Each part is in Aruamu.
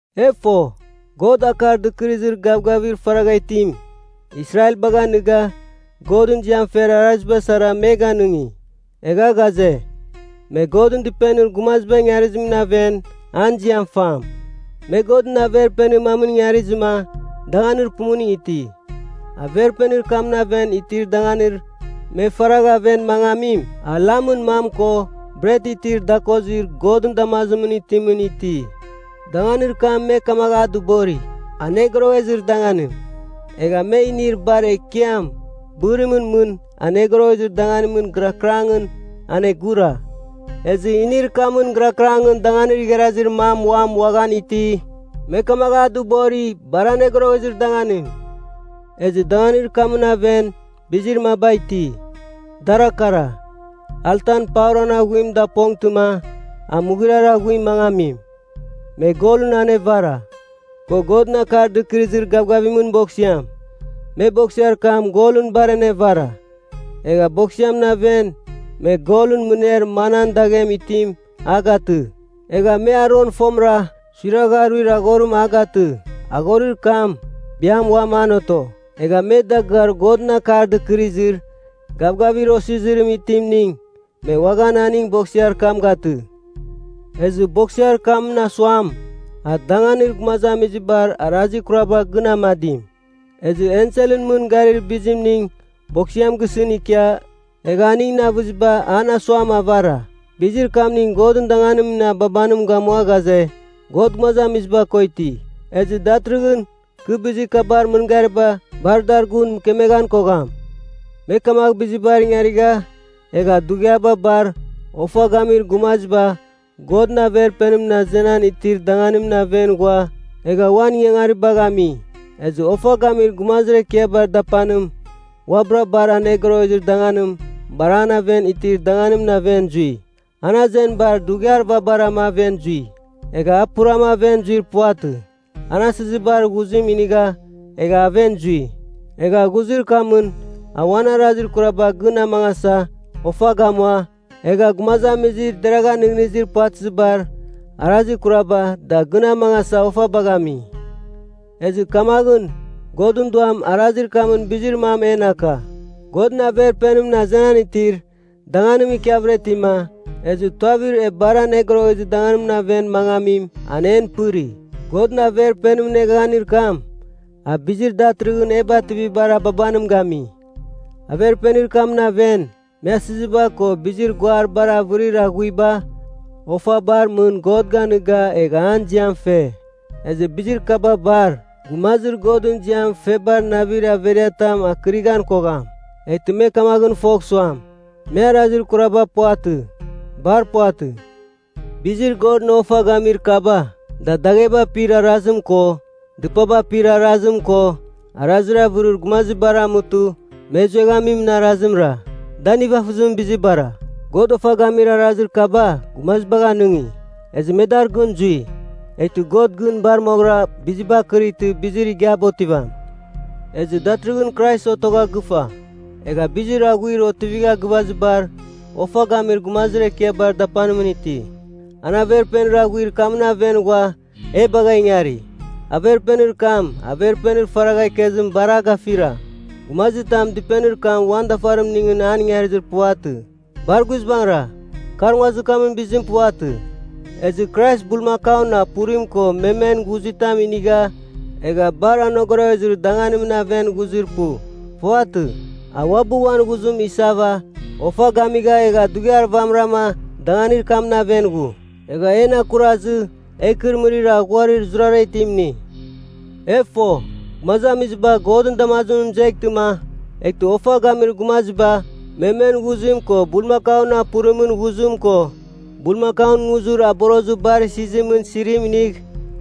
E fo, God Akar Dɨkɨrɨzir Gavgavir faragha itim, Israelbagh aniga Godɨn ziam fer araziba sara me ganɨngi. Egha ghaze, me Godɨn Dɨpenir gumaziba ingarizimɨn aven an ziam fam. Me Godɨn Averpenir mam ingarizɨma danganir pumuning iti. Averpenir kamɨn aven itir danganir me faragha aven mangamim, a lamɨn mam ko bret itir dakozir Godɨn damazimɨn itimɨn iti. Danganir kam me kamagh a dɨbori, “Anogoroghezir Danganim.” Egha me inir bar ekiam, bɨrimɨn mɨn Anogoroghezir Danganimɨn gɨrakɨrangɨn anegura. Ezɨ inir kamɨn gɨrakɨrangɨn danganir igharazir mam uam uaghan iti, me kamagh a dɨbori, “Bar Anogoroghezir Danganim.” Ezɨ danganir kamɨn aven bizir maba iti, dara kara: Altan pauran aghuim dapongtɨma a mughuriar aghuim mangamim, me golɨn anevara, ko Godɨn Akar Dɨkɨrɨzir Gavgavimɨn Boksiam. Me Boksiar kam golɨn bar anevara. Egha Boksiamɨn aven me golɨn mɨner manan daghem itim a gatɨ. Egha me Aron fomɨra suiragha aruir aghorim a gatɨ, aghorir kam biam uam an oto. Egha me Dagɨar Godɨn Akar Dɨkɨrɨzir Gavgavir Osizirim itimning, me uaghan aning Boksiar kam gatɨ. Ezɨ Boksiar kamɨn asuam, a danganir gumazamizibar arazir kuraba gɨn amadim. Ezɨ enselɨn mɨn garir bizimning Boksiam gisɨn ikia, egha aningɨn avɨziba an asuam avara. Bizir kamning Godɨn danganimɨn ababanim gamua ghaze, God gumazamiziba ko iti. Ezɨ datɨrɨghɨn kɨ bizir kabar mɨngariba bar dar gun mɨkemeghan kogham. Me kamagh bizibar ingarigha egha dughiaba bar ofa gamir gumaziba Godɨn Averpenimɨn azenan itir danganimɨn aven ghua egha uan ingangaribagh ami. Ezɨ Ofa Gamir Gumazir Ekiabar Dapanim uabɨra Bar Anogoroghezir Danganim, bar aven itir danganimɨn aven zui. An azenibar dughiar vabarama aven zui. Egha a purama aven zuir puvatɨ. A asɨzibar ghuzim inigha egha aven zui. Egha ghuzir kamɨn a uan arazir kuraba gɨn amangasa ofa gamua, egha gumazamizir deragha nɨghnɨzir puvatɨzibar arazir kuraba, da gɨn amangasa ofabagh ami. Ezɨ kamaghɨn, Godɨn Duam arazir kamɨn bizir mam en aka, Godɨn Averpenimɨn azenan itir danganim ikiavɨra itima, ezɨ tuavir e Bar Anogoroghezir Danganimɨn aven mangamim an en pɨri. Godɨn Averpenimɨn eghaghanir kam, a bizir datɨrɨghɨn e bativamibar ababanim gami. Averpenir kamɨn aven, me asɨziba ko bizir guar bar avɨrir aghuiba ofabar mɨn God ganɨga egha an ziam fe. Ezɨ bizir kaba bar gumazir Godɨn ziam febar navir averiatam akɨrɨghan kogham, eghtɨ me kamaghɨn fogh suam, me arazir kuraba puvatɨ. Bar puvatɨ. Bizir Godɨn ofa gamir kaba, da dagheba apir arazim ko dɨpaba apir arazim ko arazir avɨrir gumazibara amutɨ me zueghamin arazimra. Da nivafɨzimɨn bizibara. God ofa gamir arazir kaba gumazibagh anɨngi, ezɨ me dar gɨn zui, eghtɨ God gɨn bar moghɨra biziba akɨrightɨ bizir igiaba otivam. Ezɨ datɨrɨghɨn Krais otogha gɨfa, egha bizir aghuir otivigha gɨvazibar Ofa Gamir Gumazir Ekiabar Dapanimɨn iti. An Averpenir aghuir kamɨn aven ghua e bagha ingari. Averpenir kam Averpenir faragha ikezim bar a gafira. Gumazitam dɨpenir kam uan dafarimningɨn an ingarizir puvatɨ. Bar guizbangɨra kar nguazir kamɨn bizim puvatɨ. Ezɨ Krais bulmakaun apurim ko memen ghuzitam inigha egha Bar Anogoroghezir Danganimɨn aven ghuzir pu. Puvatɨ. A uabɨ uan ghuzim isava ofa gamigha egha dughiar vamɨrama danganir kamɨn aven ghu. Egha en akurazɨ, e ikɨrɨmɨrir aghuarir zurara itim ini. E fo, gumazamiziba Godɨn damazimɨn mɨzeghtɨma, eghtɨ ofa gamir gumaziba memen ghuzim ko bulmakaun apurimɨn ghuzim ko bulmakaun nguzir aborozir bar isizimɨn sirim inigh,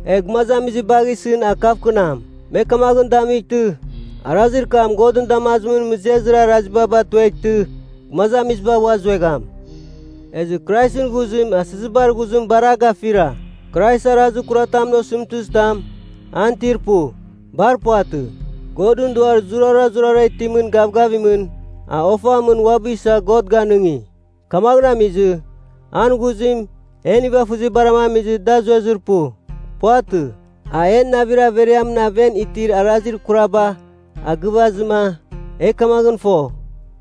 egh gumazamizibagh isɨn a kavkɨnam. Me kamaghɨn damightɨ, arazir kam Godɨn damazimɨn mɨzezir araziba batueghtɨ gumazamiziba ua zuegham. Ezɨ Kraisɨn ghuzim asizibar ghuzim bar a gafira! Krais arazir kuratamɨn osɨmtɨzitam an itir pu. Bar puvatɨ. Godɨn Duar zurazurara itimɨn gavgavimɨn, a ofan mɨn uabɨ isa God ganɨngi. Kamaghɨn amizɨ, an ghuzim en nivafɨzibarama amizɨ da zuezir pu. Puvatɨ. A en navir averiamɨn aven itir arazir kuraba a gɨvazɨma, e kamaghɨn fo,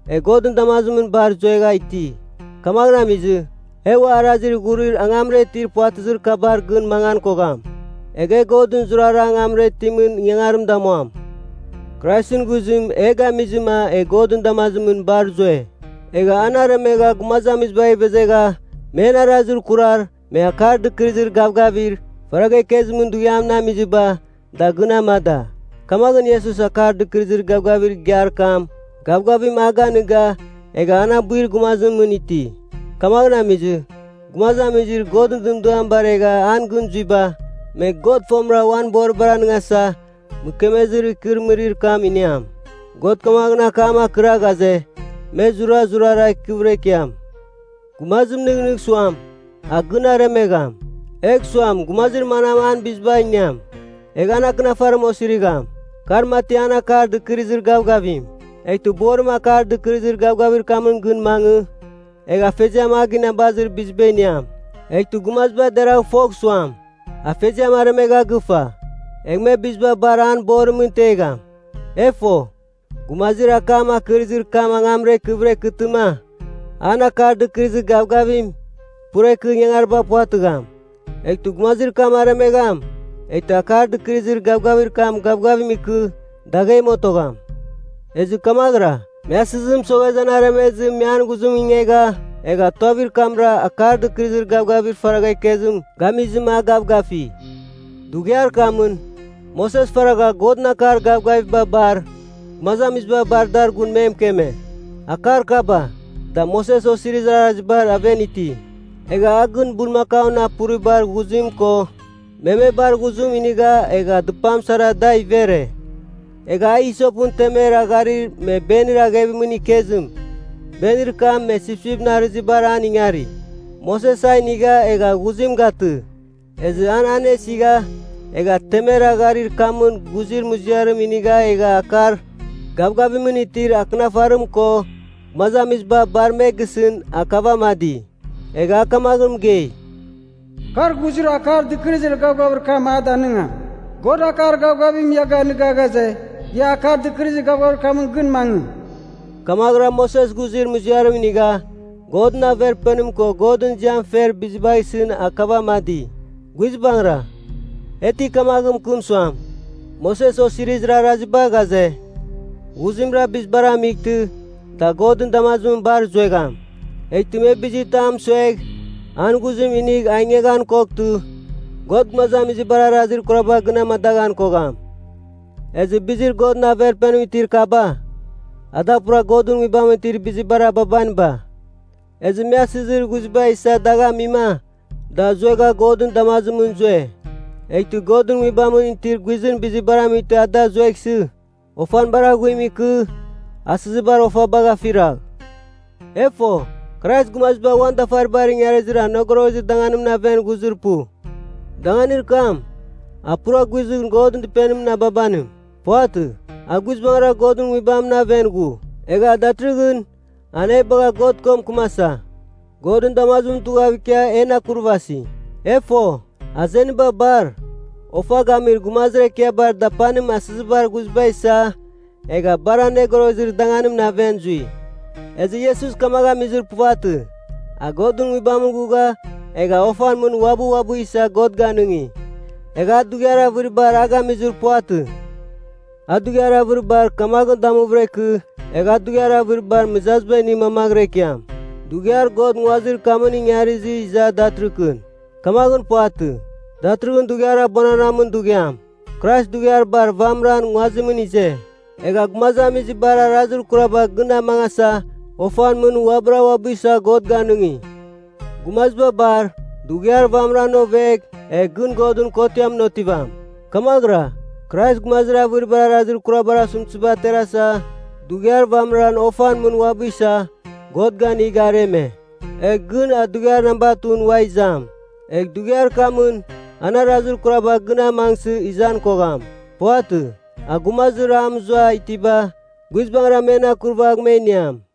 e Godɨn damazimɨn bar zuegha iti. Kamaghɨn amizɨ, e ua arazir ghurir angamra itir puvatɨzir kabar gɨn mangan kogham, egh e Godɨn zurara angamra itimɨn ingangarim damuam. Kraisɨn ghuzim e gamizɨma e Godɨn damazimɨn bar zue. Egha an aremegha gumazamizibagh ivezegha men arazir kurar me Akar Dɨkɨrɨzir Gavgavir faragha ikezimɨn dughiamɨn amiziba, da gɨn amada. Kamaghɨn, Iesus Akar Dɨkɨrɨzir Gavgavir Igiar kam gavgavim a ganɨga egha an abuir gumazimɨn iti. Kamaghɨn amizɨ, gumazamizir Godɨn dɨmdiam baregha an gɨn zuiba, me God fomɨra uan boribar anɨngasa mɨkemezir ikɨrɨmɨrir kam iniam. God kamaghɨn akam akɨra ghaze, me zurazurara ikɨvɨra ikiam. Gumazim nɨghnɨgh suam, a gɨn aremegham, egh suam gumazir manam an biziba iniam, egh an akɨnafarim osirigham. Kar mati an Akar Dɨkɨrɨzir Gavgavim. Eghtɨ borim Akar Dɨkɨrɨzir Gavgavir kamɨn gɨn mangɨ, egh afeziam a ginabazir biziba iniam. Eghtɨ gumaziba deragh fogh suam, afeziam aremegha gɨfa, egh me biziba bar an borimɨn tegham. E fo, gumazir akam akɨrɨzir kam angamra ikɨvɨra ikɨtɨma, an Akar Dɨkɨrɨzir Gavgavim pura ikɨ ingangariba puvatɨgham. Eghtɨ gumazir kam aremegham, eghtɨ Akar Dɨkɨrɨzir Gavgavir kam gavgavim ikɨ daghem otogham. Ezɨ kamaghɨra, me asɨzim mɨsoghezɨ an aremezɨ me an ghuzim ingegha, egha tuavir kamra Akar Dɨkɨrɨzir Gavgavir faragha ikezim gamizɨma, a gavgafi. Dughiar kamɨn, Moses faragha Godɨn akar gavgaviba bar, gumazamiziba bar dar gun me mɨkeme. Akar kaba, da Moses Osirizir Arazibar aven iti. Egha a gɨn bulmakaun apuribar ghuzim ko memebar ghuzim inigha egha dɨpam sarama da ivere. Egha a, isopɨn temer agharir me benir aghevimɨn ikezim, benir kam me sipsipɨn arɨzibar an ingari, Moses a inigha egha ghuzim gatɨ. Ezɨ an anesigha egha temer agharir kamɨn ghuzir muziarim inigha egha akar gavgavimɨn itir Akɨnafarim ko gumazamiziba bar me gisɨn akavamadi. Egha a kamaghɨn mɨgei, “Kar ghuzir Akar Dɨkɨrɨzir Gavgavir kam gavgavim a danɨngamim. God akar gavgavim ia ganɨga ghaze, ia Akar Dɨkɨrɨzir Gavgavir kamɨn gɨn mangɨ.” Kamaghɨra Moses ghuzir muziarim inigha Godɨn Averpenim ko Godɨn ziam fer bizibagh isɨn akavamadi. Guizbangɨra, e ti kamagh mɨkɨm suam, Moses Osirizir Araziba ghaze, ghuzimra bizibar amightɨ, da Godɨn damazimɨn bar zuegham. Eghtɨ me bizitam mɨsuegh an ghuzim inigh a ingeghan koghtɨ, God gumazamizibar arazir kuraba gɨn amadaghan kogham. Ezɨ bizir Godɨn Averpenimɨn itir kaba, ada pura Godɨn Nguibamɨn itir bizibar ababaniba. Ezɨ me asɨzir ghuzibar isa a dagh amima da zuegha Godɨn damazimɨn zue. Eghtɨ Godɨn Nguibamɨn itir guizɨn bizibar amightɨma ada zueghsɨ, ofan bar aghuim ikɨ, asɨzibar ofabagh afiragh. E fo, Krais gumaziba uan dafaribar ingarizir Anogoroghezir Danganimɨn aven ghuzir pu, danganir kam, a pura guizɨn Godɨn Dɨpenimɨn ababanim. Puvatɨ. A guizbangɨra Godɨn Nguibamɨn aven ghu. Egha datɨrɨghɨn an e bagha God ko mɨkɨmasa, Godɨn damazimɨn tughav ikia en akurvasi. E fo, azeniba bar, Ofa Gamir Gumazir Ekiabar Dapanim asɨzibar ghuziba isa egha Bar Anogoroghezir Danganimɨn aven zui. Ezɨ Iesus kamagh amizir puvatɨ, a Godɨn Nguibamɨn ghugha egha ofan mɨn uabɨ uabɨ isa God ganɨngi. Egha a dughiar avɨribar a gamizir puvatɨ. A dughiar avɨribar kamaghɨn damuvɨra ikɨ, egh a dughiar avɨribar mɨzaziba ini mamaghɨra ikiam, dughiar God nguazir kam ingarizɨ iza datɨrɨkɨn. Kamaghɨn puvatɨ. Datɨrɨghɨn dughiar abuananamɨn dughiam, Krais dughiar bar vamɨran nguazimɨn ize, egha gumazamizibar arazir kuraba gɨn amangasa ofan mɨn uabɨra uabɨ isa God ganɨngi. Gumaziba bar dughiar vamɨran ovegh egh gɨn Godɨn kotiamɨn otivam. Kamaghɨra, Krais gumazir avɨribar arazir kurabar osɨmtɨziba aterasa, dughiar vamɨran ofan mɨn uabɨ isa God ganigha areme. Egh gɨn a dughiar namba 2ɨn ua izam, egh dughiar kamɨn an arazir kuraba gɨn amangsɨ izan kogham. Puvatɨ. A gumazir a mɨzua itiba guizbangɨra men akurvagh me iniam.